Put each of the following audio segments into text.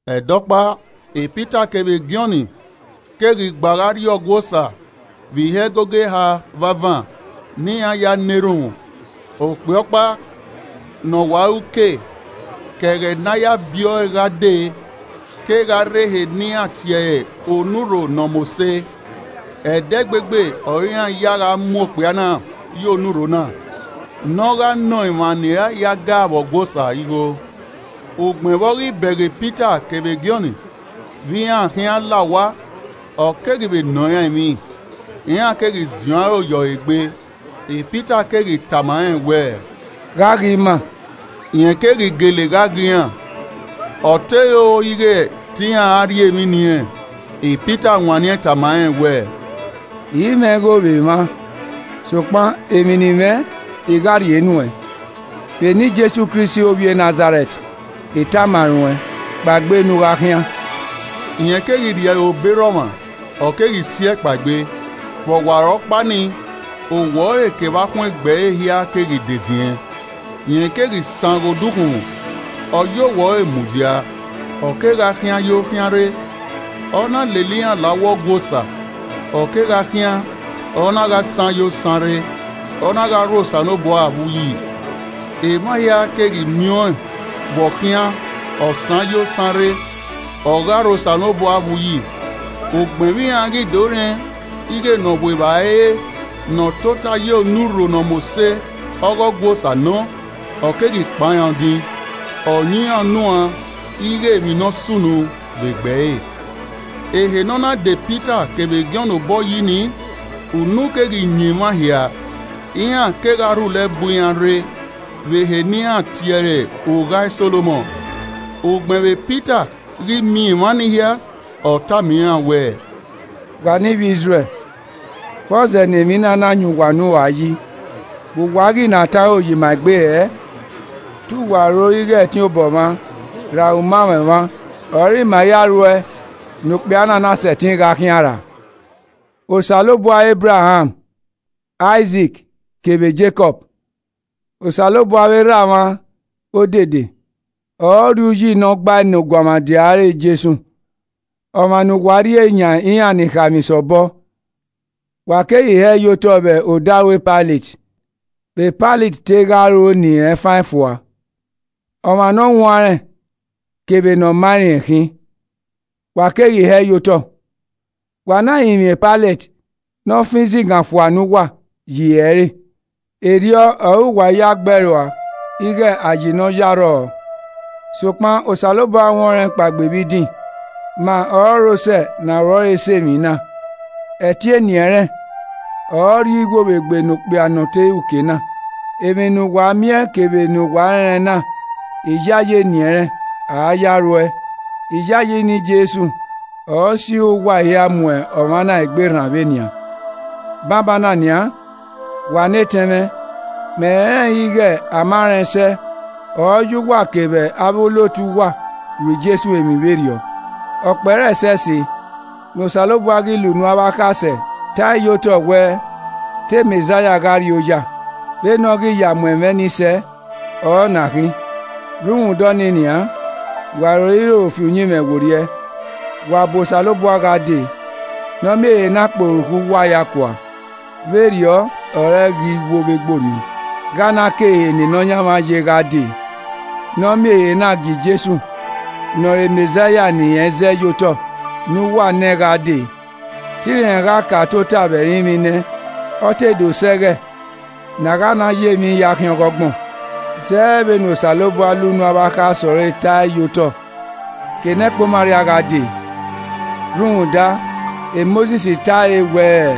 Ẹdẹ Ọkpa, Pita kevbe Jọn keghi gba gha rrie Ọgua Osa vbe ihe ẹgogo eha vbe avan, ne iran ya na erhunmwu. Okpia ọkpa na ọ wa re uke ke ẹghẹ ne a ya biẹ ọe gha dee kegha rre ehe ne iran tie ẹre Onurho Ne ọ mose. Ẹdẹgbegbe ọre iran ya gha mu okpia na ye onurho na, ne ọ gha nọ emwa ni ra ya ga vbe Ọgua Osa, igho. Ugbẹn vbe ọ ghi bẹghe Pita kevbe Jọn vbe iran khian la owa, ọ keghi vbe nọ iran emwi. Iran keghi ziẹn aro ye ọre egbe, Pita keghi tama rẹn wẹẹ, “Gha ghe ima.” Rẹn keghi gele gha ghe iran, ọ te ro ighe te iran ra rhie emwi ne irẹn. Pita wanniẹn tama rẹn wẹẹ, “I i mwẹ igho vbe emwa, sokpan emwi ne I mwẹ, I gha rhie nuẹn, Vbe eni Jesu Kristi ovbi e Nazarẹt, I tama ruẹn kpaegbe ne u khian.” Rẹn keghi rhie ẹre obọ erha ọmwa, ọ keghi si ẹe kpaegbe, vbe ọwarọkpa nii, owẹ ọre kevbe akhuẹn egbe ẹre hia keghi de ziẹn. Rẹn keghi san ghe ukhunmwu, ọ ya owẹ ọre mudia, ọ kegha khian yo khian rre. Ọ na lele iran la uwu Ọgua Osa, ọ kegha khian, ọ na gha san yo san rre, ọ na gha rho Osanobua vbe uyi. Emwa hia keghi miẹn ọẹn vbe ọ khian, ọ san yo san rre, ọ gha rho Osanobua vbe uyi. Ugbẹn vbe iran ghi do rẹn ighe ne ọ vbu evbare re ne ọ tota ye “Onurho Ne ọ mose” ọghe Ọgua Osa nọ, ọ keghi kpan iran odin, ọ yan iran unu uan ighe emwi ne ọ sunu vbe egbe ẹre. Ehe ne ọ na da Pita kevbe Jọn obọ yi nii, unu keghi yan emwa hia, iran kegha rhulẹ bu iran rre vbe ehe ne iran tie ẹre “Ugha Solomọn.” Ugbẹn vbe Pita ghi miẹn emwa nii hia, ọ tama iran wẹẹ, “Wa ne ivbi Izrẹl, vbọzẹ ne emwi na na yan uwa unu uan yi, vbe uwa ghi na tọn aro ye ima egbe hẹẹ? Te uwa ro ighe ẹtin obọ mwa ra umamwẹ mwa ọre ima ya ru ẹe ne okpia na na sẹtin ghe khian ra? Osanobua Ebraham, Aizik kevbe Jekọb, Osanobua avbe erha mwa odede, ọre ọ rhie uyi ne ọ gbae ne Ọguọmwadia ẹre Jesu, ọmwa ne uwa rhie yan iran ni khaemwisẹ obọ, wa keghi hẹẹ ye otọ vbe odaro Pailet, vbe Pailet te gha ho ne irẹn fan ẹn fua. Ọmwa ne ọ huanrẹn kevbe ne ọ maa rẹn khin, wa keghi hẹẹ ye otọ, wa na rinmwian Pailet ne ọ fan izigan fua ne uwa ye ihe ẹre. Erriọ ọre uwa ya gbe ẹe rua ighe Ayi ne ọ yi arrọọ. Sokpan Osanobua huẹn ọnrẹn kpaegbe vbe idin, ma ọrọre osẹe ne aro ẹre sẹ emwi na. Ẹtin eni ẹnrẹn, ọre ọ rhie iwo vbe egbe ne okpia nọ te re uke na. Emwi ne uwa miẹn kevbe ne uwa rẹnrẹn na, iyayi eni ẹnrẹn ọre a ya ruẹe, iyayi eni Jesu ọre ọ sirra uwa hia mu ọmwa na egbe rran vbe nian. “Banbanna nian, wa ne etẹn mwẹ, mẹ rẹnrẹn ighẹ, a ma rẹn sẹ ọre ọ ya uwa kevbe avbe olotu uwa ru Jesu emwi vberriọ. Ọ kpẹre ẹsẹse ne Osanobua ghi la unu avbe akhasẹ ta ẹe ye otọ wẹ, te Mẹzaia gha rri oya, vbene ọ ghi ya mu ẹmwẹ ni sẹ ọre ọ na khin. Rhunmwuda ọnii nian, wa roiro fi uyinmwẹ werriẹ, wa bu Osanobua gha dee, ne ọ miẹn ehe na kpe orukhọ uwa hia kua. Vberriọ ọre ẹghẹ iwo vbe egbe orhiọn, gha na ke ehe ne Nọyaẹnmwẹ ye gha dee, ne ọ miẹn ehe na gie Jesu ne ọre Mẹzaia ne irẹn zẹe ye otọ ne uwa nẹ gha dee. Te irẹn gha ka tota vbe ẹrinmwi nẹ, ọ te do sẹ ẹghẹ ne a gha na ya emwi hia khian ọgbọn, zẹ vbene Osanobua la unu avbe akhasẹ ọre ta ẹe ye otọ ke ne ẹkpo imwẹ arria gha dee. Rhunmwuda Mosis ta ẹe wẹẹ,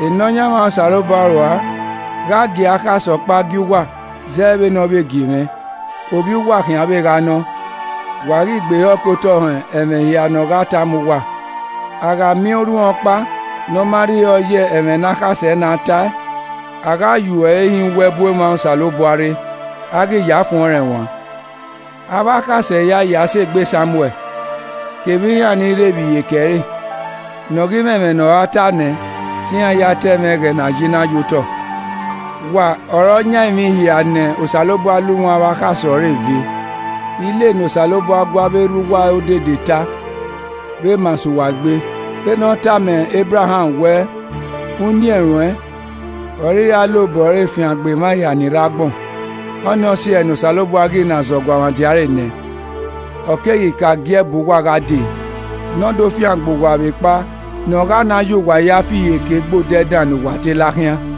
‘Nọyaẹnmwa Osanobua rua gha gie akhasẹ ọkpa gie uwa, zẹ vbene ọ vbe gie mwẹ, ovbi uwa khian vbe gha nọ. Wa ghi gbe ehọ kotọ họn ẹmwẹ hia ne ọ gha tama uwa. A gha miẹn orhiọnkpa ne ọ ma rhie ehọ ye ẹmwẹ ne akhasẹ na ta ẹe, a gha yuo ẹre hin uwu ẹbu emwa Osanobua rre, a ghi ya fuẹn ọnrẹn uan.’ Avbe akhasẹ hia, ya sẹ egbe Samuẹl, kevbe iran ni rre vbe iyeke ẹre, ne ọ ghi mwẹ ẹmwẹ ne ọ ra ta nẹ, te iran hia ta ẹmwẹ ẹghẹ ne a ye na ye otọ. Wa ọre ọ yan emwi hia ne Osanobua la unu avbe akhasẹ ọre ve, ile ne Osanobua gu avbe erha uwa odede ta, vbe ma sẹ uwa egbe. Vbene ọ tama Ebraham wẹẹ, ‘Uniẹn ruẹn ọre I ra la obọ ẹre fiangbe emwa hia ni rre agbọn.’ Ọnii ọ si ẹe ne Osanobua ghi na zẹ Ọguọmwadia ẹre nẹ, ọ keghi ka gie ẹe bu uwa gha dee ne ọ do fiangbe uwa vbe ekpa ne ọ gha na ya uwa hia fi iyeke gbe odẹ dan ne uwa te la khian.”